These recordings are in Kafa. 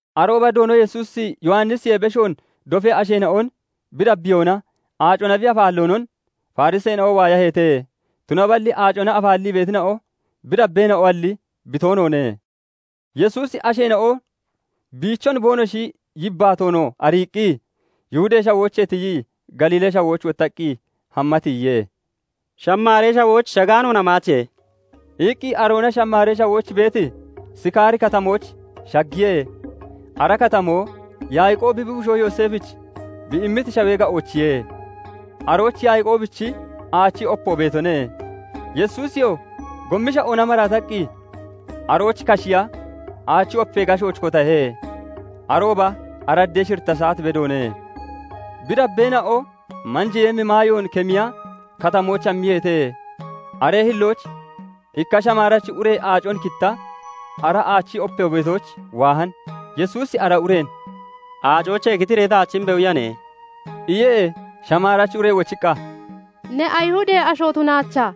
Arooba Doono Yesuusi Yowannisiyee beshoon dofee asheena'on bi dabbiyoonaa aacona bi afaalloonon Fariseena'o waayaheete; Tunaballi aacona afaallii beetina'o bi dabbeena'oalli, bi toonoone. Yesuusi asheena'o biichon boonoshi yibbaatoonoo ariiqqi, Yihudee Shawoochee tiyii Galiilee Shawooch wottaqqi hamma tiyiye. "Shamaaree Shawooch shagaanoon hamaache" iqqi aroona Shamaaree Shawooch beeti Sikaari Katamooch shaggiye. Ara katamoo Yaaqoobi bi bushoo Yooseefich bi immiti shawee ga'oochiye. Arooch Yaaqoobichi aachi opo beetone. Yesuusiyoo gommi sha'oona maraataqqi arooch kashiya aachi opee gashooch kotahe; arooba araddee shiritta saat bedoone. Bi dabbeena'o manjeeyemmi maayoon kemiya katamooch hammiyeete. Aree hillooch ikka Shamaarachi ure aacon kitta, ara aachi opo beetooch waahan. Yesuusi ara ureen "Aacoochee kitiree taach imbe! Uyane" iye. Shamaarachi ure wochiqqa, "Ne Ayihudee asho tunaachaa,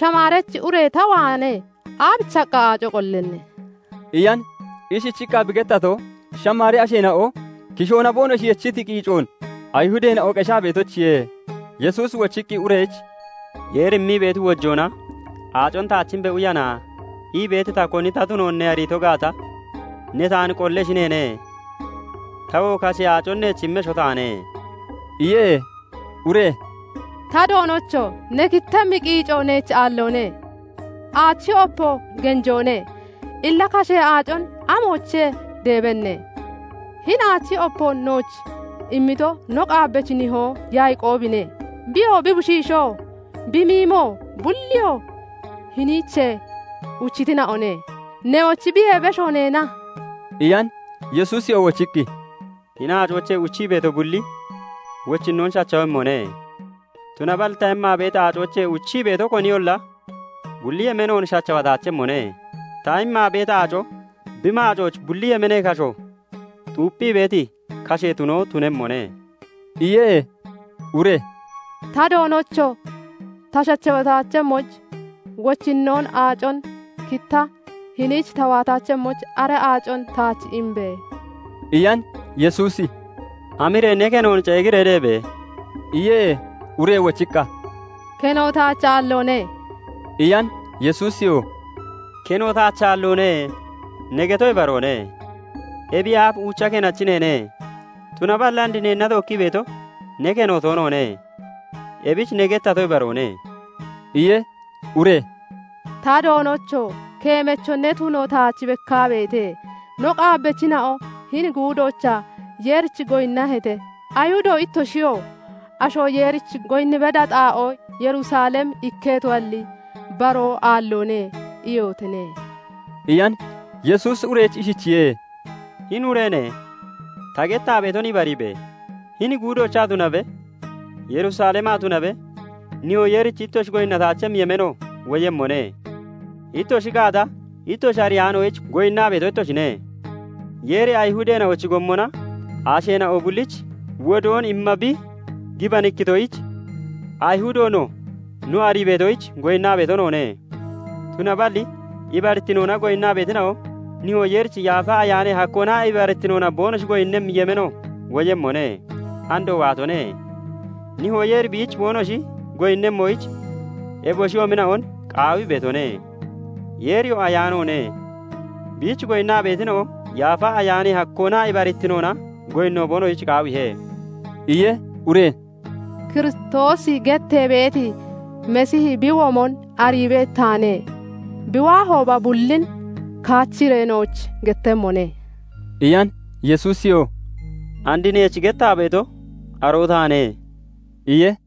Shamaarachi ure ta waanee aabichiqqa aacon ucha qollanne?" iyan. Ishichiqqa bi gettato, Shamaaree asheena'o kishoona boonoshi yechiti qiicoon Ayihudeena'o qeshaa beetoyichiye. Yesuusi wochiqqi ureyich "Yeeri immii beeti wojoonaa 'Aacon taach imbe! Uyana' ii beeti ta koni ta tunoonon ne ariito gaata, ne taan qolleshi neene; tawoo kashee aacon neech immesho taane" iye. Ure "Ta Doonocho! Ne kittemmi qiico neech aalloone; aachi opoo genjoone. Illa kashee aacon amoochee deebenne? Hini aachi opoon nooch immito no qaabbachi nihoo Yaaqoobine; biyoo, bi bushiishoo, bi miimo bulliyoo hiniichee uchitina'one. Newochi biyee besho neena?" iyan. Yesuusiyoo wochiqqi, "Hini aacoochee uchii beeto bulli wochinnoon shachawemmone; Tunaballi ta immaa beeti aacoochee uchii beeto koniyolla bulli yemeenoon shachawataachemmone. Ta immaa beeti aaco bi maacooch bulli yemeenee kasho xuupphii beeti kashee tunoo tunemmone" iye. Ure "Ta Doonocho! Ta shachawataachemmoyich, wochinnoon aacon kitta hiniich ta waataachemmoyich, ara aacon taach imbe!" iyan. Yesuusi "Hamiree ne kenoon ceegiree deebe!" iye. Ure wochiqqa, "Keno taach aalloone" iyan. Yesuusiyoo " 'Keno taach aalloone' ne geto ibaroone. Ebiyee aaf uucha kenachi neene; tunaballi and neenna tookkii beeto ne keno toonoone. Ebich ne gettato ibaroone" iye. Ure "Ta Doonocho! Keemacho ne tuno taach bekkaa beete. No qaabbachina'o hini guudoochaa Yeerich goyinnaheete. Ayihudo ittoshiyoo 'Asho Yeerich goyinni beda xaa'oo Yerusalem ikketoalli, baroo aalloone' iyotine" iyan. Yesuusi ureyich ishichiye:- "Hini ureene! Ta gettaa beeton ibariibe! Hini guudoochaa tunabe, Yerusalemaa tunabe, Nihoo Yeerich ittoshi goyinnataachemmi yemeeno woyemmone. Ittoshi gaata, ittoshi ariyaanoyich goyinnaa beeto ittoshine; Yeeri Ayihudeena'ochi gommona asheena'o bullich wodoon imma bi gibanikkitoyich, Ayihudo no, no arii beetoyich goyinnaa beeto noone. Tunaballi ibarittinoona goyinnaa beetina'o, Nihoo Yeerich Yaafa Ayaanee hakkoonaa ibarittinoona boonoshi goyinnemmi yemeeno woyemmone; andoo waatone; Nihoo Yeeri biich boonoshi goyinnemmoyich eboshiyoomina'on qaawii beetone. Yeeriyoo ayaanoone; biich goyinnaa beetina'o Yaafa Ayaanee hakkoonaa ibarittinoona goyinno boonoshich qaawiihe" iye. Ure "Kiristoosi gettee beeti Masiihi bi woyemmon arii beeti taane; bi waahooba bullin kaachiree nooch gettemmone" iyan. Yesuusiyoo "And neech gettaa beeto, aroo taane" iye.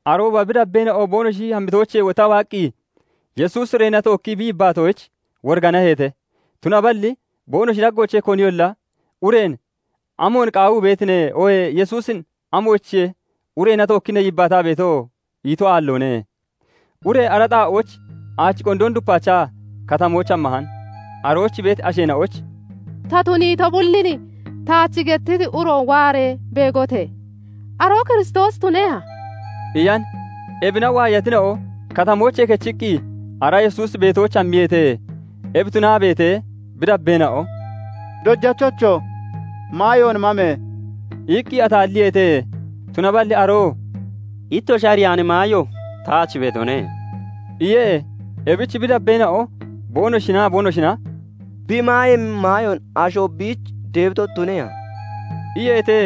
Arooba bi dabbeena'o boonoshi hammitoochee wottaa waaqqi, Yesuusi ureena tookkii bi yibbaatoyich, woriganaheete; tunaballi boonoshi daggoochee koniyolla ureen "Amoon qaawii beetine?" oohee Yesuusin "Amoyichiye ureena tookkii ne yibbaataa beeto?" ito aalloone. Ure ara xaa'ooch aachi qondoon dupaachaa katamooch hammahan. Arooch beeti asheena'oyich "Ta tuniito bullin taach gettiti uroon waaree beegote! Aroo Kiristoosi tuneha?" iyan. Ebina waayatina'o katamoochee kechiqqi ara Yesuusi beetooch hammiyeete. Ebi tunaa beetee, bi dabbeena'o "Dojachocho! Maayoon mame!" iqqi ataalliyeete. Tunaballi aroo "Ittoshi ariyaani maayo taach beetone" iye. Ebich bi dabbeena'o boonoshinaa boonoshina "Bi maayemmi maayoon asho biich deebito tuneha?" iyeete.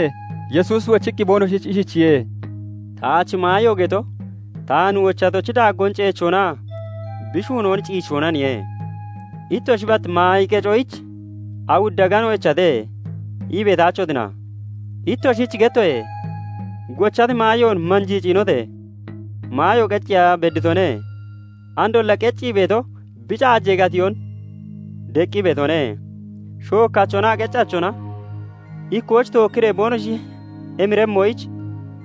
Yesuusi wochiqqi boonoshich ishichiye:- "Taach maayo geto, taan wochatochi daaggoon ceechoonaa bi shuunoon ciichoonaniye. Ittoshi 'Bat maayi qecoyich awudda agano echate' ii beetaachotina? Ittoshich gettoye:- Gochati maayoon manjii ciinote! Maayo qecceeya bedditone. Andolla qeccii beeto bi caajee gatiyoon deqqii beetone; shookkachonaa qeccachona ikkooch tookkiree boonoshi emiremmoyich,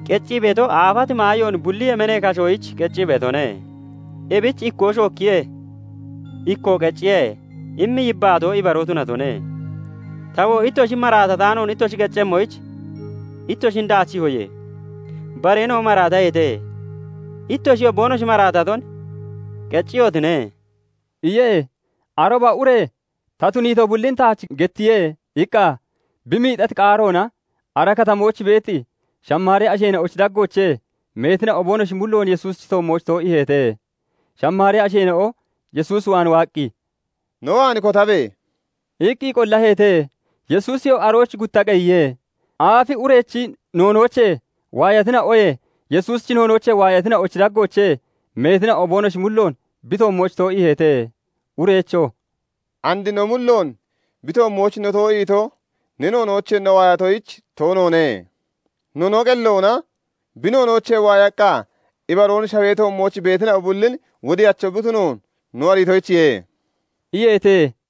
qeccii beeto aafati maayoon bulli yemeenee kashoyich kicii beetone. Ebich 'Ikkoo shookkiye; ikkoo qecciye' immi yibbaatoo ibaroo tunatone. Tawoo ittoshi maraatataanoon ittoshi qeccemmoyich ittoshin daachiihoye. Bareena'o maraataheete; ittoshiyoo boonoshi maraataton qecciyotine" iye. Arooba ure "Ta tuniito bullin taach gettiye" iqqa bi miixati qaaroona ara katamooch beeti Shamaaree asheena'ochi daggoochee meetina'o boonoshi mulloon Yesuusichi toommooch too'iiheete. Shamaaree asheena'o Yesuus waan waaqqi, "no waan kotabe!" iqqi qollaheete. Yesuusiyoo arooch gutta qeyiye. Aaf urechi noonoochee waayatina'oye, Yesuusichi noonoochee waayatina'ochi daggoochee meetina'o boonoshi mulloon bi toommooch too'iiheete. Ureyichoo "And no mulloon bi toommooch no too'iito, ne noonoochee no waayatoyich toonoone; no no qelloona bi noonoochee waayaqqa, ibaroon shawee toommooch beetina'o bullin Wodiyacho bi tunoon no ariitoyichiye" iyeete.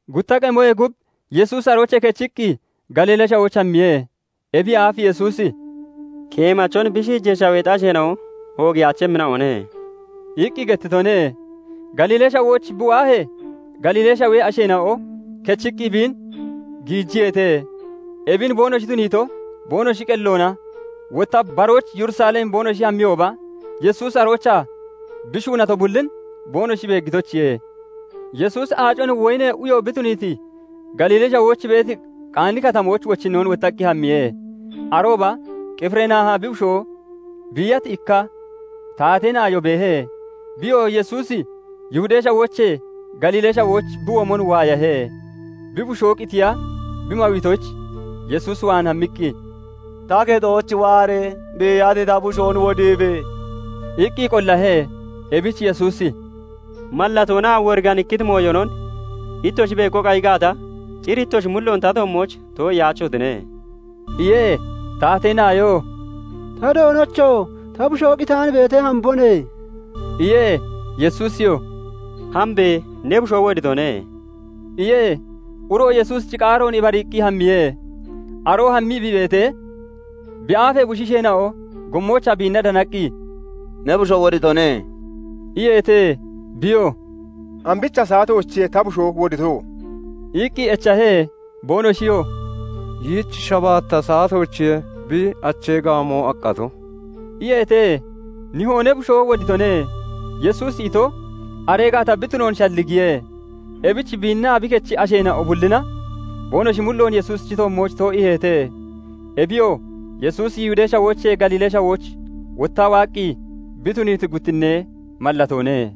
Gutta qemoyee gub Yesuusi aroochee kechiqqi Galiilee Shawooch hammiye. Ebiyee aaf Yesuusi "Keemachon bi shiijee shaweexi asheena'o oogiyaachemmina'one" iqqi gettitone. Galiilee Shawooch bi waahee, Galiilee Shawee asheena'o kechiqqi biin giijiyeete. Ebin boonoshi tuniito, boonoshi qelloona wotta baaroyich Yerusalem boonoshi hammiyooba Yesuusi aroochaa bi shuunato bullin boonoshi beeggitoyichiye. Yesuusi aacon woyinee uyo bi tuniiti, Galiilee Shawooch beeti, Qaani Katamooch wochinnoon wottaqqi hammiye. Arooba Qifirnaaha bi bushoo biiyati ikka taatee naayo beehe. Biyoo Yesuusi Yihudee Shawoochee Galiilee Shawooch bi womon waayahe; bi bushoo qitiya bi mawiitoyich Yesuus waan hammiqqi, "Ta kexooch waaree, biiyati ta bushoon wodiibe!" iqqi qollahe. Ebich Yesuusi "Mallatoonaa woriganikkiti mooyonon ittoshi beego qayi gaata, cir ittoshi mulloon ta toommooch too'iyaachotine" iye. Taatee naayoo "Ta Doonocho! Ta bushoo qitaan beetee, hambone" iye. Yesuusiyoo "Hambe! Ne bushoo woditone" iye. Uroo Yesuusichi qaaroon ibariiqqi hammiye. Aroo hammii bi beetee, bi aafee bushiisheena'o gommoochaa biinna danaqqi, "Ne bushoo woditone" iyeete. Biyoo "Ambicha saatoochiye ta bushoo wodito?" iqqi echahe. Boonoshiyoo "Yiich shabaatta saatoochiye bi achee gaamoo aqqato" iyeete. Nihoo "Ne bushoo woditone" Yesuusi ito aree gaata bi tunoon shalligiye. Ebich biinnaa bi kechi asheena'o bullina boonoshi mulloon Yesuusichi toommooch too'iiheete. Ebiyoo Yesuusi Yihudee Shawoochee Galiilee Shawooch wottaa waaqqi bi tuniiti guttinnee mallatoone.